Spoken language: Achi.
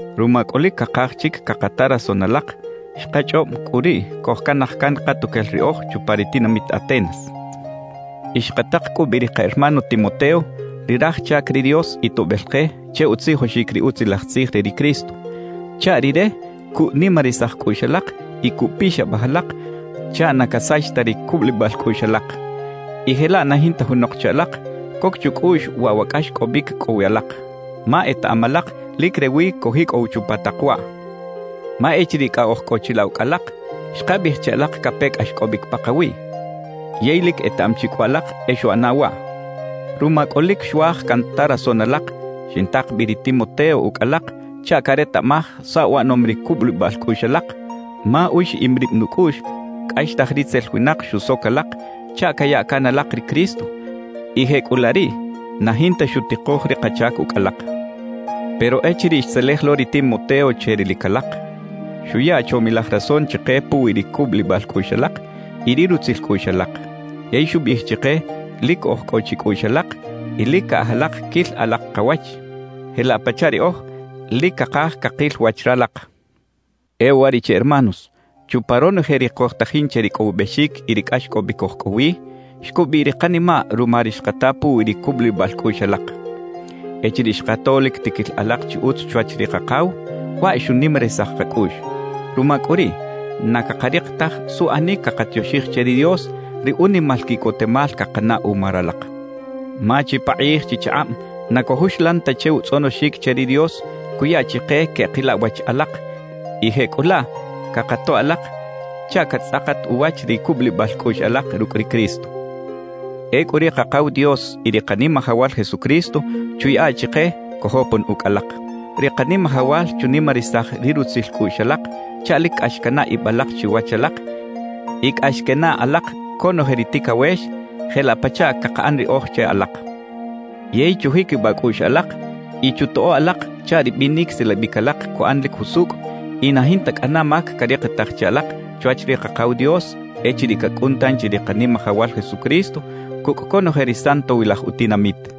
Ruma cꞌu lic cakaj chic cakata rason alak, xkachꞌob cꞌu riꞌ cojcanaj can katuquel riꞌoj chupa ri tinamit Atenas y xkatak cꞌu bi ri ka hermano Timoteo, ri raj chac ri Dios y toꞌbel ke che utzijoxic ri Utzilaj Tzij re ri Cristo, chaꞌ rire cuꞌnimarisaj cꞌuꞌx alak y cuꞌpixabaj alak chaꞌ na casach ta ri cubulibal cꞌuꞌx alak, y jelaꞌ na jinta junok che alak coc chucꞌuꞌx waꞌ wa cꞌaxcꞌobic cꞌo wi alak. Ma etaꞌam alak lic rewi cojicꞌow chupa tak waꞌ. Ma echiriꞌ cꞌa oj cꞌo chilaꞌ ucꞌ alak, xkabiꞌij che alak cape cꞌaxcꞌobic pakawiꞌ; yey lic etaꞌam chi cꞌu alak e xuꞌana waꞌ. Ruma cꞌu lic xuaj canta rason alak, xintak bi ri Timoteo ucꞌ alak chaꞌ caretaꞌmaj saꞌ uꞌanom ri cubulibal cꞌuꞌx alak; ma uxiꞌim rib nucꞌuꞌx cꞌaxtaj ritzel winak xusoc alak chaꞌ caya can alak ri Cristo y jecꞌulaꞌ riꞌ na jinta xutikoj ri kachac ucꞌ alak. Pero echiriꞌ xtzelej lo ri Timoteo che rilic alak, xuya chomilaj rason chike puwi ri cubulibal cꞌuꞌx alak y ri rutzil cꞌuꞌx alak. Yey xubiꞌij chike lic oj cꞌo chicꞌuꞌx alak y lic caꞌaj alak quil alak kawach, jelaꞌ pachaꞌ riꞌoj lic cakaj cakil wach ralak. E uwariꞌche hermanos, chupa ronoje ri cojtajin che ricꞌowibexic y ri cꞌaxcꞌobic oj cꞌo wi, xcubiꞌ ri kanimaꞌ ruma ri xkata puwi ri cubulibal cꞌuꞌx alak. Echiriꞌ xkato lic tiquil alak chi utz chwach ri Kakaw, waꞌ xunimarisaj kacꞌuꞌx. Ruma cꞌu riꞌ, na cakarik taj suꞌanic cakatioxij che ri Dios ri unimal quiꞌcotemal cakanaꞌ uma ralak. Ma chipakꞌij chichakꞌab na cojuxlan ta che utzꞌonoxic che ri Dios cuya chike queꞌkila wach alak, y jecꞌulaꞌ cakatoꞌ alak chaꞌ catzꞌakat uwach ri cubulibal cꞌuꞌx alak rucꞌ ri Cristo. Ecꞌu ri Kakaw Dios y ri Kanimajawal Jesucristo chuyaꞌa chike cojopon ucꞌ alak. Ri Kanimajawal chunimarisaj ri rutzil cꞌuꞌx alak chaꞌ lic cꞌax canaꞌ ib alak chiwach alak y cꞌax quenaꞌ alak conoje ri ticawex, jelaꞌ pachaꞌ cakaꞌan riꞌoj che alak. Yey chujiquibaꞌ cꞌuꞌx alak y chutoꞌo alak chaꞌ ri binic silabic alak cuꞌan lic jusucꞌ y na jinta cꞌana mac carikitaj che alak chwach ri Kakaw Dios echiriꞌ cacꞌun tanchi ri Kanimajawal Jesucristo cucꞌ conoje ri santowilaj utinamit.